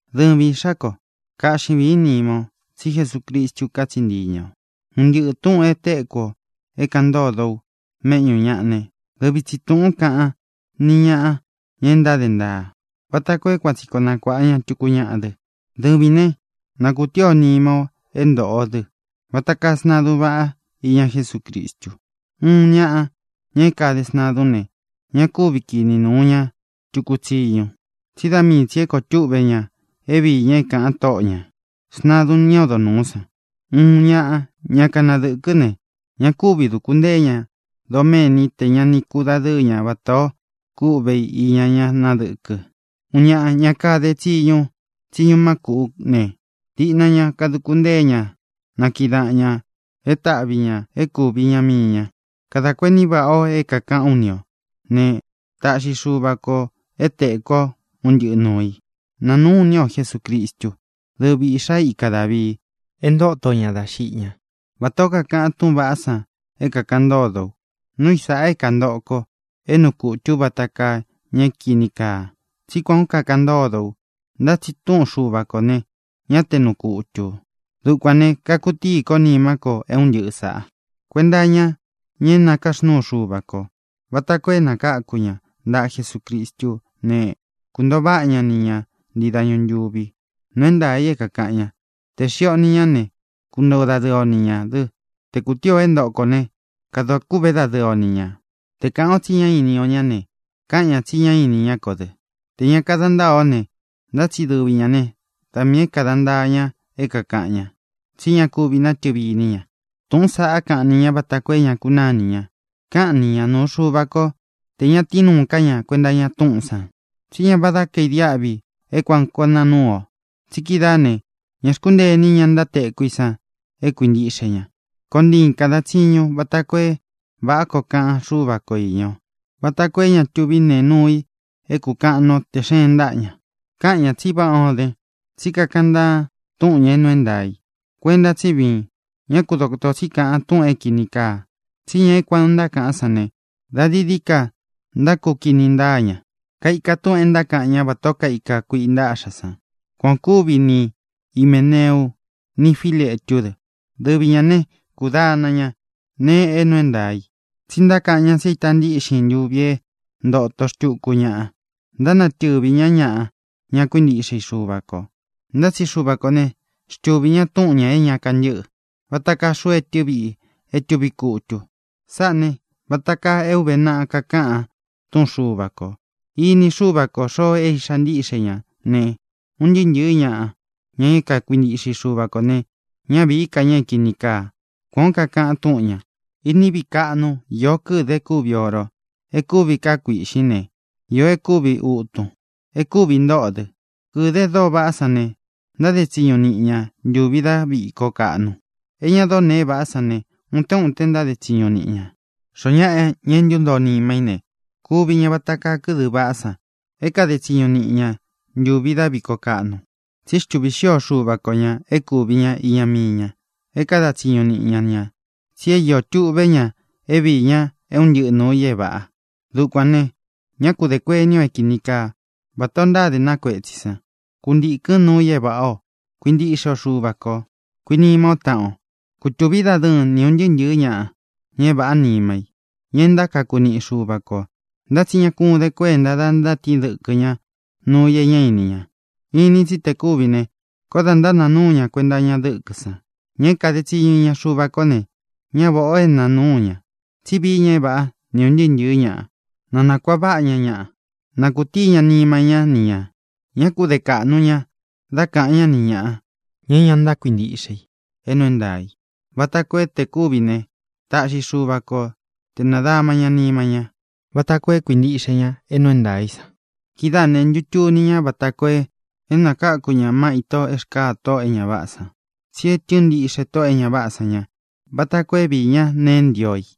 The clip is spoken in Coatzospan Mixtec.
Dɨvin, īꞌxá ko, kaꞌxi vīín nima o, tsí Jesucristu katsiꞌi ntii ña ō. Un ntɨꞌɨ tūꞌun e téku o é kākaꞌan ntódo u méꞌñū ñaꞌa ne, dɨvi tsi tūꞌún kaꞌan ni ñaꞌa, ña e ntáde ntaa, vata koo é kuan tsi koo nakuāꞌa ña tuku ñaꞌa dɨ. Dɨvīn né, na kūtií o nima o é ntōꞌo o dɨ́ vata kaa sntadun váꞌa iña Jesúcristu. Uun ñaꞌa, ña é kade sntadún ne, ña kúvi kini nūu ña tuku tsiñu, tsí da mii tsī é koo túꞌvē ña é viī ña é kāꞌan tóꞌo ñā, sntadun ñá odo nūú san. Uun ñaꞌa, ña kanadɨ̄kɨ́ ne, ña kúvi dūku ntée ña doméni tē ña ni kudadɨ́ɨ ña vatā o kúꞌvē i iña ñá nadɨ̄kɨ. Uun ñaꞌa, ña kade tsiñu tsiñu má kūꞌú ne, diꞌna ña kaduku ntée ña na kiꞌi daꞌan ñā é taꞌvi ñā é kūvi iña mii ña. Kadā kuení vaꞌā o é kākaꞌán u ni ō ne, taꞌxi Xuva kō é tēku o é un ntɨꞌɨ nuū i. Nanūꞌún iní o Jesucristu, dɨ́vi īꞌxá ika Dāvii, e ntóto ña dá xiꞌi ñá, vatā ó kakaꞌan túꞌūn vaꞌá san é kākaꞌan ntódo u. Núu i sāꞌa é kāntoꞌo ko, é nuu kutū ú vata kaa ña é kīni kaa, tsí kuān ó kakaꞌan ntódo u. Ntá tsi túꞌun Xuva kō ne, ñá te nuu kutū. Dukuān ne, kakutíi kó nimá ko é un ntɨꞌɨ sāꞌa kuenta iña ña é nakaxnúu Xuva kō, vata koo é nakáku ña ntaꞌa Jesucristú ne, kuntōo váꞌa ña ni ña ntii dañu ntūvi. Nuu é ntaā i é kākaꞌan ña: Tē xiꞌi o ni ñá ne, kuntoo dadɨɨ o ni ñā dɨ. Tē kutíi ō é ntoꞌo kō né, kadā kúꞌve dadɨɨ o ni ñā. Tē kaꞌan o tsi ñá ini o ñá ne, káꞌan ñā tsi ñá ini ñá kō dɨ. Tē ña kada ntáa ó ne, ntá tsi dɨvi ñā né, da miī é kāda ntaa ña é kākaꞌan ña, tsí ña kuvi natɨvi iní ña. Tūꞌún saꞌa káꞌan ni ña vata koo é ña kunáa ini ña. Káꞌan ni ña nuu Xuva ko tē ña tíin nuu ká ña kuenta iña túꞌūn san. Tsí ña váda kaīdiáꞌvi é kuan koo nāa núu o, tsi kídaa ne, ñā xkúntee ini ña ntátekú i san é kuīntiꞌxe ña. Koon ntiin kādan tsiñun vata koo é vāꞌá koo kaꞌan Xúva ko īña o, vata koo é ña tuví nee nuu i é kūkaꞌan nuu ó tē xeen ntáꞌa ña. Káꞌan ñā tsi váꞌā ó den, tsí kakaꞌan ntaan túꞌun ñā é nuu é ntaā i. Kuenta tsí viin; ñá ku dotō tsí kaꞌan túꞌūn é kini kaa. Tsí ña é kuān o ntákaꞌán san ne, da dií dií ka ntákukini ntáa ña. Kaika túꞌūn e ntákaꞌan ñá vatā ó kaika kuiꞌi ntaꞌxá san. Kuan ō kúvi ni Himēneu ni Fíletú dɨ. Dɨvi ñā né, kūdana ñá nēe é nuu é ntaā í, tsi ntákaꞌan ñá tsi é īta ntíꞌxin ntuvi é ntōto xtuku ñaꞌa. Ntánatɨvī ñá ñaꞌa, ña kuíntiꞌxe i Xuva kō. Ntá tsi Xuva kō né, xtuvī ñá túꞌun ñā é ña kantɨ́ꞌɨ, vata kaa xuu etɨ viꞌi é tuvi kutu. Sáꞌā ne, vata kaa é ūve naꞌa kakaꞌan túꞌun Xuva kō: “Ini Xúva kō xoo é iꞌxá ntiꞌxe ña” ne, “Un ntɨɨ́ ntɨ̄ɨ́ ñaꞌa, ña é kakuintiꞌxe i Xuva kō ne, ñá vīí ka ña é kīni kaa.” Kuān ó kakaꞌan túꞌun ñā. Iní viꞌi kaꞌnu iō kɨdɨ e kúvi oro, e kúvi káa kuīꞌxín ne, īó e kúvi ūtun, e kúvi ntóꞌō dɨ. Kɨ̄dɨ́ e dóo vaꞌá san ne, ntáde tsiñu niꞌi ña ntuvi dá viko kaꞌnu. E ña dóo neē vaꞌá san ne, utén uten ntáde tsiñu niꞌi ña. Xoó naꞌa, ña é ntuntoo nima í ne, kuvi ña vata kaa kɨ́dɨ vaꞌá san é kāde tsiñu niꞌi ña ntuvi dá viko kaꞌnu. Tsi xtúvi xio Xuva ko ñā é kūvi ña iña mii ña, é kada tsiñu niꞌi ña ña, tsi é iō tuꞌve ña é viī ña é un ntɨꞌɨ nūu i é vāꞌa. Dukuān ne, ñá ku dē kuení o é kīni kaa, vatā o ntáde na kuetsī san. Kuntīkɨn núu i é vāꞌá ō. Kuintiꞌxe o Xuva kō. Kuinima ó taꞌan o. Kutūvín dadɨɨn ni ūn ntɨɨ́ ntɨ̄ɨ́ ñaꞌa, ña é vāꞌá nima í, ña e ntákaku niꞌi Xuva kō. Ntá tsi ña kún den kuénta da ntátiin dɨkɨ́ ñaꞌa nuu i é ña íni ña. Inin tsi te kúvi ne, koó da ntánāa núu ña kuenta iña dɨ́kɨ̄ san. Ña é kāde tsiñu iña Xuva kó ne, ñá vāꞌá o é nāa núu ña, tsí vií ña é vāꞌá ni ūn ntɨɨ́ ntɨ̄ɨ́ ñaꞌa. Na nakuāꞌa váꞌa ña ñaꞌa, na kūtíi ña nima ñá ni ñā. Ñá ku de kāꞌnu ña dá kāꞌan ñá ni ñāꞌa, ña é ña ntákuintiꞌxe i é nuu é ntaā i, vata koo é tē kúvi ne, taꞌxi Xuva ko te nādama ña nima ñá vata koo é kuintiꞌxe ña é nuu é ntaā í san. Kidáā ne, ntutuni ña vata koo é nakáku ña má ito e xkáa tóꞌō e ña váꞌā san. Tsí e tɨ́ɨn ntiꞌxe tóꞌō e ña váꞌā san ña vata koo é viī ñá nēe e ntío i.